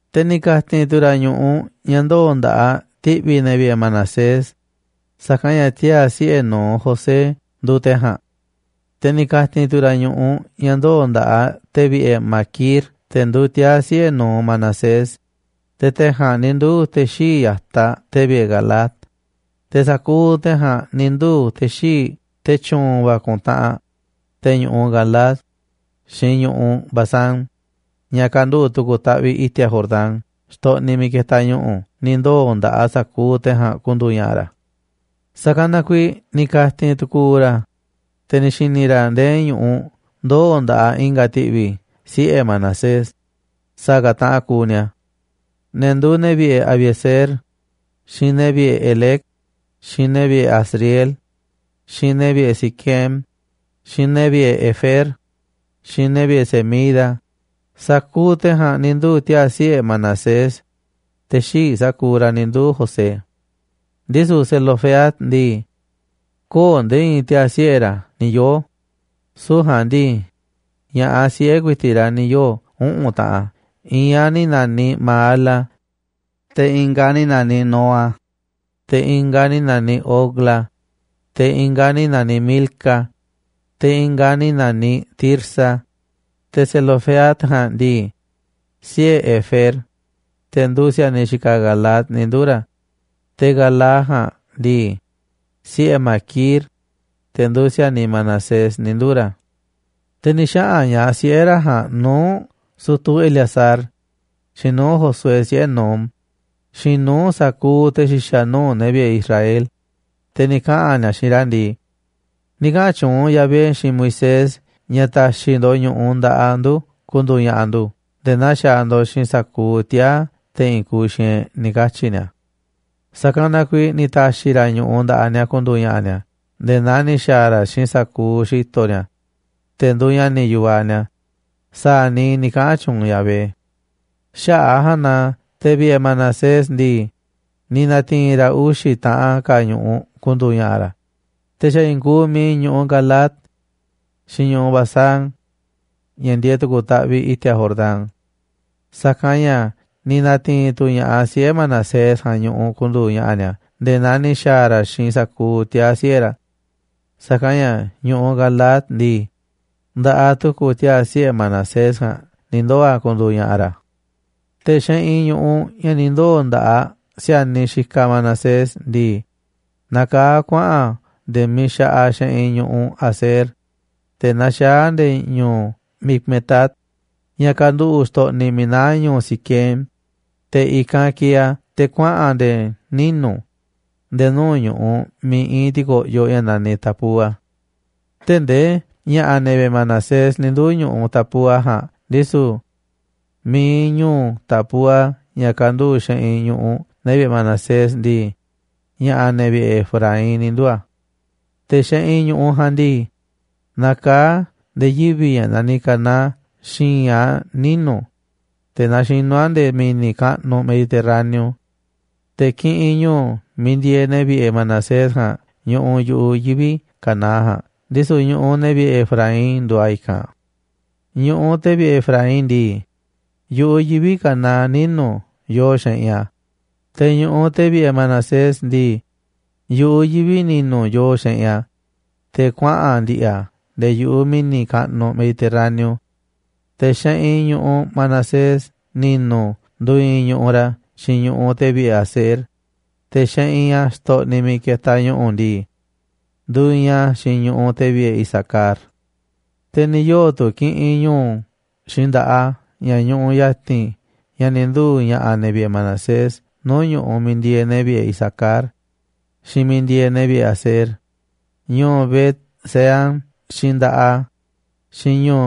Te̱ ni̱ ka̱ti̱n tu̱ ra̱ ñu̱ꞌuꞌ ña̱ ndoo̱ nda̱ꞌaꞌ ti̱ꞌvi̱ te̱ vi̱ꞌe̱ Manasés, sa̱kanꞌ ña̱ tiaa̱ siꞌe̱ nu̱uꞌ José nduuꞌ te̱ ja̱a̱nꞌ. Te̱ ni̱ ka̱ti̱n tu̱ ra̱ ñu̱ꞌuꞌ ña̱ ndoo̱ nda̱ꞌaꞌ te̱ vi̱ꞌe̱ Maquir te̱ nduuꞌ tiaa̱ siꞌe̱ nu̱uꞌ Manasés, te̱ te̱ ja̱a̱nꞌ ni̱ nduu̱ te̱ xíiꞌ ya̱taꞌ te̱ vi̱ꞌe̱ Galaad, te̱ sa̱kuuꞌ te̱ ja̱a̱nꞌ ni̱ nduu̱ te̱ xíinꞌ, te̱ tyu̱u̱n va̱ ku̱ntaꞌanꞌ, te̱ ñu̱ꞌuꞌ Galaad, xiinꞌ ñu̱ꞌuꞌ Basán, ña̱ kanduꞌu̱ꞌ tu̱ku̱ taꞌviꞌ i̱ti̱a̱ Jordán, xtoꞌniꞌ miiꞌ ketaꞌ ñu̱ꞌu̱ ni̱ ndoo̱ nda̱ꞌaꞌ sa̱kuuꞌ te̱ ja̱a̱nꞌ ku̱ndu̱u̱ ña̱ꞌa̱ ra̱. Sa̱kanꞌ na kuiiꞌ ni̱ ka̱ti̱n tu̱ku̱u̱ ra̱, te̱ ni̱ xi̱ni̱ ra̱ ndee ñu̱ꞌuꞌ ndoo̱ nda̱ꞌaꞌ i̱nga̱ ti̱ꞌvi̱ siꞌe̱ Manasés, sa̱a̱ ka̱ taꞌan kuuꞌ ni̱a̱: ne̱ nduuꞌ ne̱ vi̱ꞌe̱ Abiezer, xiinꞌ ne̱ vi̱ꞌe̱ Helec, xiinꞌ ne̱ vi̱ꞌe̱ Asriel, xiinꞌ ne̱ vi̱ꞌe̱ Siquem, xiinꞌ ne̱ vi̱ꞌe̱ Hefer, xiinꞌ ne̱ vi̱ꞌe̱ Semida. Sa̱kuuꞌ te̱ ja̱a̱nꞌ ni̱ nduu̱ tiaa̱ siꞌe̱ Manasés, te̱ xii̱ꞌ sa̱kuuꞌ ra̱ ni̱ nduu̱ José. Ndisu̱ Zelofehad ndii, köo̱ꞌ nde̱e̱ i̱i̱n tiaa̱ siꞌe̱ ra̱ ni̱ yoo̱, süu̱ꞌ ja̱a̱nꞌ ndii, ña̱ꞌaꞌ siꞌe̱ ku̱i̱ti̱ꞌ ra̱ ni̱ yoo̱ uꞌu̱n taꞌan: i̱i̱n aꞌ ni̱ na̱niꞌ Maala, te̱ i̱nga̱ aꞌ ni̱ na̱niꞌ Noa, te̱ i̱nga̱ aꞌ ni̱ na̱niꞌ Hogla, te̱ i̱nga̱ aꞌ ni̱ na̱niꞌ Milca, te̱ i̱nga̱ ka̱ aꞌ ni̱ na̱niꞌ Tirsa. Te̱ Zelofehad ja̱a̱nꞌ ndii, siꞌe̱ Hefer, te̱ nduuꞌ si̱a̱niꞌ Galaad ni̱ nduu̱ ra̱, te̱ Galaad ja̱a̱nꞌ ndii, siꞌe̱ Maquir, te̱ nduuꞌ si̱a̱niꞌ Manasés ni̱ nduu̱ ra̱. Te̱ ni̱ xaꞌa̱n ña̱ꞌaꞌ siꞌe̱ ra̱ ja̱a̱nꞌ nuu̱ꞌ sutu̱ Eleazar, xiinꞌ nuu̱ꞌ Josué, siꞌe̱ Nun, xiinꞌ nuu̱ꞌ sa̱kuuꞌ te̱ xi̱xa̱ nuu̱ꞌ ne̱ vi̱ꞌe̱ Israel, te̱ ni̱ kaꞌa̱n ni̱a̱ xiinꞌ ra̱ ndii: ―Ni̱ kaꞌa̱n tyuunꞌ Yahvé xiinꞌ Moisés ña̱ ta̱xi̱ ndo̱ꞌ ñu̱ꞌuꞌ nda̱ꞌaꞌ ndu̱ ku̱ndu̱u̱ ña̱ꞌa̱ ndu̱ nde̱e̱ naa xaaꞌ ndo̱ꞌ xiinꞌ sa̱kuuꞌ tiaa̱ te̱ i̱i̱n kuuꞌ xiinꞌ e̱ꞌ ―ni̱ katyi̱ ni̱a̱. Sa̱kanꞌ na kuiiꞌ ni̱ ta̱xi̱ ra̱ ñu̱ꞌuꞌ nda̱ꞌaꞌ ni̱a̱ ku̱ndu̱u̱ ña̱ꞌa̱ ni̱a̱ nde̱e̱ naa ni̱ xa̱a̱ ra̱ xiinꞌ sa̱kuuꞌ xi̱to̱ ni̱a̱, te̱ nduuꞌ ña̱ni̱ yu̱vaꞌ ni̱a̱, sa̱a̱ niiꞌ ni̱ kaꞌa̱n tyuunꞌ Yahvé. Xaꞌa̱ꞌ a̱ ja̱a̱nꞌ na te̱ vi̱ꞌe̱ Manasés ndii, ni̱ na̱ti̱i̱n ra̱ uxi̱ taꞌan ka̱ ñu̱ꞌuꞌ ku̱ndu̱u̱ ña̱ꞌa̱ ra̱, te̱ xa̱ i̱i̱n kuuꞌ miiꞌ ñu̱ꞌuꞌ Galaad xiinꞌ ñu̱ꞌuꞌ Basán ña̱ ndieeꞌ tu̱ku̱ taꞌviꞌ i̱ti̱a̱ Jordán. Sa̱kanꞌ ña̱ ni̱ na̱ti̱i̱n tu̱ ña̱ꞌaꞌ siꞌe̱ Manasés ja̱a̱nꞌ ñu̱ꞌuꞌ ku̱ndu̱u̱ ña̱ꞌa̱ ni̱a̱ nde̱e̱ naa ni̱ xa̱a̱ ra̱ xiinꞌ sa̱kuuꞌ tiaa̱ siꞌe̱ ra̱. Sa̱kanꞌ ña̱ ñu̱ꞌuꞌ Galaad ndii, nda̱ꞌaꞌ tu̱ku̱ tiaa̱ siꞌe̱ Manasés ja̱a̱nꞌ ni̱ ndoo̱ a̱ ku̱ndu̱u̱ ña̱ꞌa̱ ra̱. Te̱ xeꞌinꞌ ñu̱ꞌuꞌ ña̱ ni̱ ndoo̱ nda̱ꞌaꞌ si̱a̱niꞌ xikaꞌ Manasés ndii, nakaá a̱ kuaꞌa̱n a̱ nde̱e̱ miiꞌ xaꞌaꞌ xeꞌinꞌ nuu̱ꞌ ñu̱ꞌuꞌ Aser, te̱ naxaá a̱ nde̱e̱ ñu̱u̱ Micmetat, ña̱ kanduꞌu̱ꞌ xtoꞌniꞌ miiꞌ naá ñu̱u̱ Siquem, te̱ i̱kanꞌ kieeꞌ a̱ te̱ kuaꞌa̱n a̱ nde̱e̱ ninu̱, nde̱e̱ nuu̱ꞌ ñu̱ꞌuꞌ miiꞌ i̱i̱n ti̱ko̱ꞌyoꞌ ña̱ naniꞌ Tapúa. Tee̱ꞌ ndee ña̱ꞌa̱ ne̱ vi̱ꞌe̱ Manasés ni̱ nduu̱ ñu̱ꞌuꞌ Tapúa ja̱a̱nꞌ, ndisu̱ mi̱iꞌ ñu̱u̱ Tapúa, ña̱ kanduꞌu̱ꞌ xeꞌinꞌ ñu̱ꞌuꞌ ne̱ vi̱ꞌe̱ Manasés ndii, ña̱ꞌa̱ ne̱ vi̱ꞌe̱ Efraín ni̱ nduu̱ a̱. Te̱ xeꞌinꞌ ñu̱ꞌuꞌ ja̱a̱nꞌ ndii, nakaa̱ꞌ a̱ nde̱e̱ yivi̱ ña̱ naniꞌ Caná xi̱i̱nꞌ a̱ ninu̱, te̱ naxinú a̱ nde̱e̱ mi̱ni̱ kaꞌnuꞌ Mediterráneo. Te̱ kiꞌinꞌ ñu̱u̱ miiꞌ ndieeꞌ ne̱ vi̱ꞌe̱ Manasés ja̱a̱nꞌ ñuꞌuꞌ yu̱ꞌuꞌ yivi̱ Caná ja̱a̱nꞌ, ndisu̱ ñu̱ꞌuꞌ ne̱ vi̱ꞌe̱ Efraín nduuꞌ a̱ i̱kanꞌ. Ñu̱ꞌuꞌ te̱ vi̱ꞌe̱ Efraín ndii, yu̱ꞌuꞌ yivi̱ Caná ninu̱ yooꞌ xeꞌinꞌ a̱, te̱ ñu̱ꞌuꞌ te̱ vi̱ꞌe̱ Manasés ndii, yu̱ꞌuꞌ yivi̱ꞌ ni̱nu̱ yoo xeꞌinꞌ a̱, te̱ kuaꞌa̱n ndi̱ꞌi̱ a̱ nde̱e̱ yu̱ꞌuꞌ mi̱ni̱ kaꞌnuꞌ Mediterráneo. Te̱ xeꞌinꞌ ñu̱ꞌuꞌ Manasés ni̱nu̱ nduiinꞌ ñu̱ꞌuꞌ ra̱ xiinꞌ ñu̱ꞌuꞌ te̱ vi̱ꞌe̱ Aser, te̱ xeꞌinꞌ a̱ xtoꞌniꞌ miiꞌ ketaꞌ ñu̱ꞌu̱ ndii, nduiinꞌ a̱ xiinꞌ ñu̱ꞌuꞌ te̱ vi̱ꞌe̱ Isacar. Te̱ ni̱ yoo̱ tu̱ kiꞌinꞌ ñu̱u̱ xiinꞌ nda̱ꞌaꞌ a̱ ña̱ ñuꞌuꞌ ya̱ti̱n ña̱ ni̱ nduu̱ ña̱ꞌa̱ ne̱ vi̱ꞌe̱ Manasés nuu̱ꞌ ñu̱ꞌuꞌ miiꞌ ndieeꞌ ne̱ vi̱ꞌe̱ Isacar xiinꞌ miiꞌ ndieeꞌ ne̱ vi̱ꞌe̱ Aser: Ñu̱u̱ Bet-seán xiinꞌ nda̱ꞌaꞌ a̱, xiinꞌ ñu̱u̱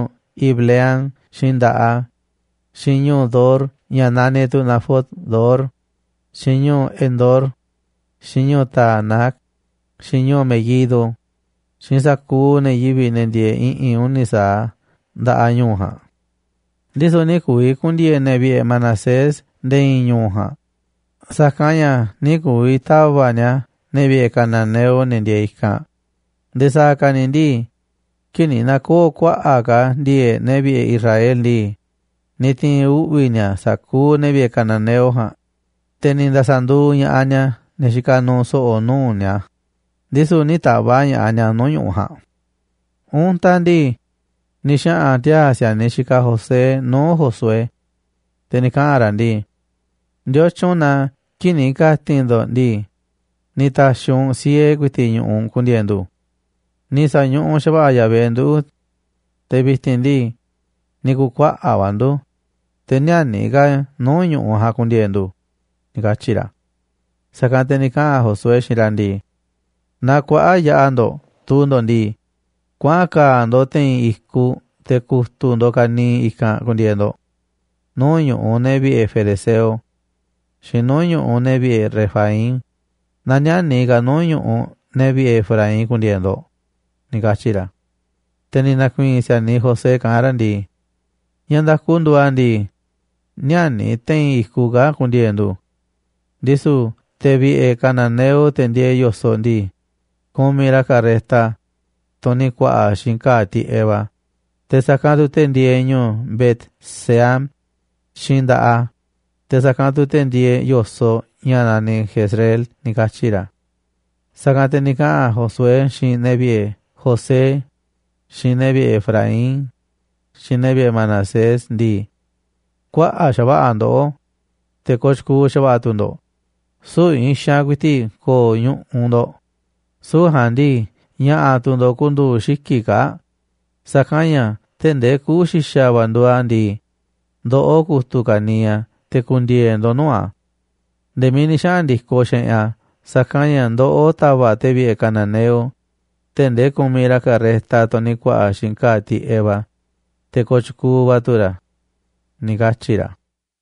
Ibleam xiinꞌ nda̱ꞌaꞌ a̱, xiinꞌ ñu̱u̱ Dor, ña̱ naniꞌ tu̱ Nafot-dor, xiinꞌ ñu̱u̱ Endor, xiinꞌ ñu̱u̱ Taanac, xiinꞌ ñu̱u̱ Meguido, xiinꞌ sa̱kuuꞌ ne̱ yivi̱ꞌ, ne̱ ndieeꞌ i̱ꞌi̱n uni̱ sa̱aꞌ nda̱ꞌaꞌ ñu̱u̱ ja̱a̱nꞌ. Ndisu̱ nï̱ ku̱vi̱ ku̱ndi̱e̱e̱ ne̱ vi̱ꞌe̱ Manasés nde̱e̱ i̱i̱n ñu̱u̱ ja̱a̱nꞌ, sa̱kanꞌ ña̱ nï̱ ku̱vi̱ ta̱va̱ꞌ ni̱a̱ ne̱ vi̱ꞌe̱ cananeo, ne̱ ndieeꞌ i̱kanꞌ. Nde̱e̱ sa̱a̱ ka̱ ni̱ ndii, kii̱ꞌ ni̱ na̱koo̱ kuaꞌa̱ꞌ ka̱ ndi̱e̱e̱ꞌ ne̱ vi̱ꞌe̱ Israel ndii, ni̱ ti̱i̱n uꞌvi̱ ni̱a̱ sa̱kuuꞌ ne̱ vi̱ꞌe̱ cananeo ja̱a̱nꞌ, te̱ ni̱ nda̱sa̱ nduuꞌ ña̱ꞌaꞌ ni̱a̱ ne̱ xikaꞌ nuuꞌ so̱ꞌo̱ nuu̱ꞌ ni̱a̱, ndisu̱ nï̱ ta̱va̱ꞌ ña̱ꞌaꞌ ni̱a̱ nuu̱ꞌ ñu̱ꞌuꞌ ja̱a̱nꞌ. Untaꞌ ndii, ni̱ xaꞌa̱n tiaa̱ si̱a̱niꞌ xikaꞌ José nuu̱ꞌ Josué, te̱ ni̱ kaꞌa̱n ra̱ ndii: ―¿Ndiotyun na kii̱ꞌ ni̱ ka̱ti̱n ndo̱ꞌ ndii, ni̱ ta̱xi̱ u̱nꞌ siee ku̱i̱ti̱ꞌ ñu̱ꞌuꞌ ku̱ndi̱e̱e̱ ndu̱? Ni̱ sa̱ñuꞌuꞌ xa̱va̱ꞌa̱ Yahvé nduꞌu̱, te̱ vi̱ti̱n ndii, ni̱ ku̱u̱ kuaꞌa̱ꞌ va̱ ndu̱, te̱ nï̱a̱ni̱ ka̱ nuu̱ꞌ ñu̱ꞌuꞌ ja̱a̱nꞌ ku̱ndi̱e̱e̱ ndu̱ ―ni̱ katyi̱ ra̱. Sa̱kanꞌ te̱ ni̱ kaꞌa̱n Josué xiinꞌ ra̱ ndii: ―Naaꞌ kuaꞌa̱ꞌ yaꞌa̱ ndo̱ꞌ tuu ndo̱ꞌ ndii, kuaꞌan ka̱a̱ ndo̱ꞌ te̱i̱n i̱kuꞌ te̱ ku̱tu̱ ndo̱ꞌ ka̱niiꞌ i̱kanꞌ ku̱ndi̱e̱e̱ ndo̱ꞌ nuu̱ꞌ ñu̱ꞌuꞌ ne̱ vi̱ꞌe̱ ferezeo xiinꞌ nuu̱ꞌ ñu̱ꞌuꞌ ne̱ vi̱ꞌe̱ Refaim, naaꞌ nï̱a̱ni̱ ka̱ nuu̱ꞌ ñu̱ꞌuꞌ ne̱ vi̱ꞌe̱ Efraín ku̱ndi̱e̱e̱ ndo̱ꞌ ―ni̱ katyi̱ ra̱. Te̱ ni̱ na̱ku̱i̱i̱n si̱a̱niꞌ José kaꞌán ra̱ ndii: ―Ña̱ nda̱ku nduuꞌ a̱ ndii, nï̱a̱ni̱ te̱i̱n i̱kuꞌ kaa̱ꞌ ku̱ndi̱e̱e̱ ndu̱. Ndisu̱ te̱ vi̱ꞌe̱ cananeo, te̱ ndieeꞌ yo̱soꞌ ndii, kumiꞌ ra̱ carreta, tunꞌ ni̱ ku̱a̱ꞌa̱ xiinꞌ ka̱a̱ tiꞌeꞌ va̱, te̱ sa̱kanꞌ tu̱ te̱ ndieeꞌ ñu̱u̱ Bet-seán xiinꞌ nda̱ꞌaꞌ a̱, te̱ sa̱kanꞌ tu̱ te̱ ndieeꞌ yo̱soꞌ ña̱ naniꞌ Jezreel ―ni̱ katyi̱ ra̱. Sa̱kanꞌ te̱ ni̱ kaꞌa̱n Josué xiinꞌ ne̱ vi̱ꞌe̱ José, xiinꞌ ne̱ vi̱ꞌe̱ Efraín, xiinꞌ ne̱ vi̱ꞌe̱ Manasés ndii: ―Kuaꞌa̱ꞌ xa̱va̱ꞌa̱ ndoꞌó, te̱ kooꞌ tyukuuꞌ xa̱va̱ꞌa̱ tu̱ ndo̱ꞌ. Süu̱ꞌ i̱i̱n xaanꞌ ku̱i̱ti̱ꞌ ko̱o̱ ñu̱ꞌuꞌ ndo̱ꞌ, süu̱ꞌ ja̱a̱nꞌ ndii, ña̱ꞌa̱ tu̱ ndo̱ꞌ ku̱ndu̱u̱ xiki̱ꞌ kaa̱ꞌ, sa̱kanꞌ ña̱ tee̱ꞌ ndee kuꞌu̱ xi̱xa̱ va̱ nduuꞌ a̱ ndii, ndoꞌó ku̱tu̱ ka̱niiꞌ a̱ te̱ ku̱ndi̱e̱e̱ ndo̱ꞌ nuu̱ꞌ a̱ nde̱e̱ miiꞌ ni̱ xaꞌa̱n ndi̱koꞌ xeꞌinꞌ a̱. Sa̱kanꞌ ña̱ ndoꞌó ta̱va̱ꞌ te̱ vi̱ꞌe̱ cananeo, tee̱ꞌ ndee kumiꞌ ra̱ carreta, tunꞌ ni̱ ku̱a̱ꞌa̱ xiinꞌ ka̱a̱ tiꞌeꞌ va̱, te̱ kooꞌ tyukuuꞌ va̱ tu̱ ra̱ ―ni̱ katyi̱ ra̱.